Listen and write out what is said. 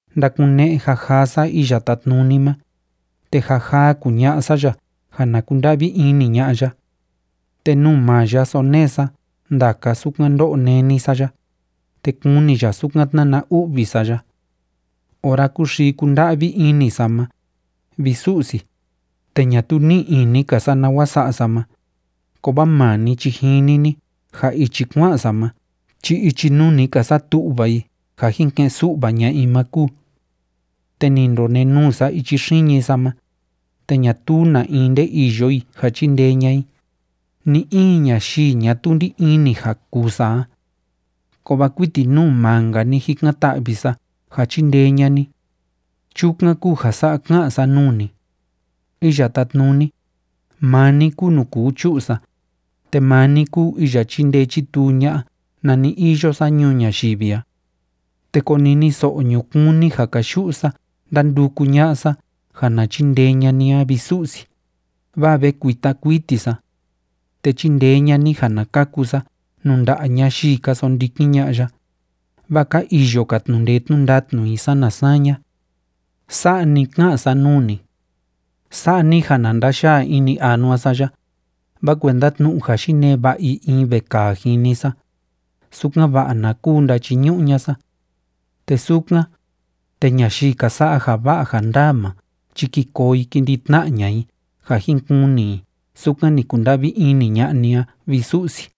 Ndakune'e jajaa sa Iya Tátnuni ma, te jajaa kuña'a sa ya ja na kunda'vi ini ña'a ya. Te nuu maa ya sonee sa ndaka sukan ndó'o néni sa ya, te kuni ya sukan tnána u'vi sa ya. Ora kúxii kúnda'vi ini sa ma, vi Su'si, te ñatuu ní'i ini‑ka sa nawa sa'a sa ma, kovaa maa ni chi jini ni ja ichi kua'an sa ma chi ichi nuu ni ka satu'va i ja jin ke'en su'va ña'a i ma kúu. Te ni ndakonenuu sa ichi xiñi sa ma, te ñatuu na in nde iyo i ja chindee ña'a i, ni‑in ñayii ñatuu ndí ini ja kuu sa a. Kovaa kuiti nuu maa‑nka ni jikan‑ta'vi sa ja chindee ña'a ni. Chukan kúu ja sa'a ká'an sa nuu ni: “Iya Tátnuni, maa ni kúu nuu kuu chu'u sa, te maa ni kúu iya chíndee chítuu ña'a nani iyo sa ñuu ñayivi a. Te koniniso'o ñukuun ni ja káyu'u sa ndánduku ña'a sa ja na chindee ña'a ni a, vi Su'si, vaa ve kuita kuiti sa. Te chindee ña'a ni ja na kaku sa nuu nda'a ñayii ka sondikin ña'a ya, vaa ka iyo‑ka tnu'u ndee tnu'u ndatnu i sana saña.” Sa'a ni ká'an sa nuu ni. Sa'a ni ja na ndayaa ini anua sa ya, vaa kuenda tnu'u ja yinee va'a i in vekaa jini sa, sukan‑va'a na kuu ndachiñu'u ña'a sa. Te sukan, te ñayii ka sa'a ja va'a ja ndaa ma chi ki koo i ki ndi tna'a ña'a i ja jin kuni i sukan ni kunda'vi ini ña'a ni a, vi Su'si.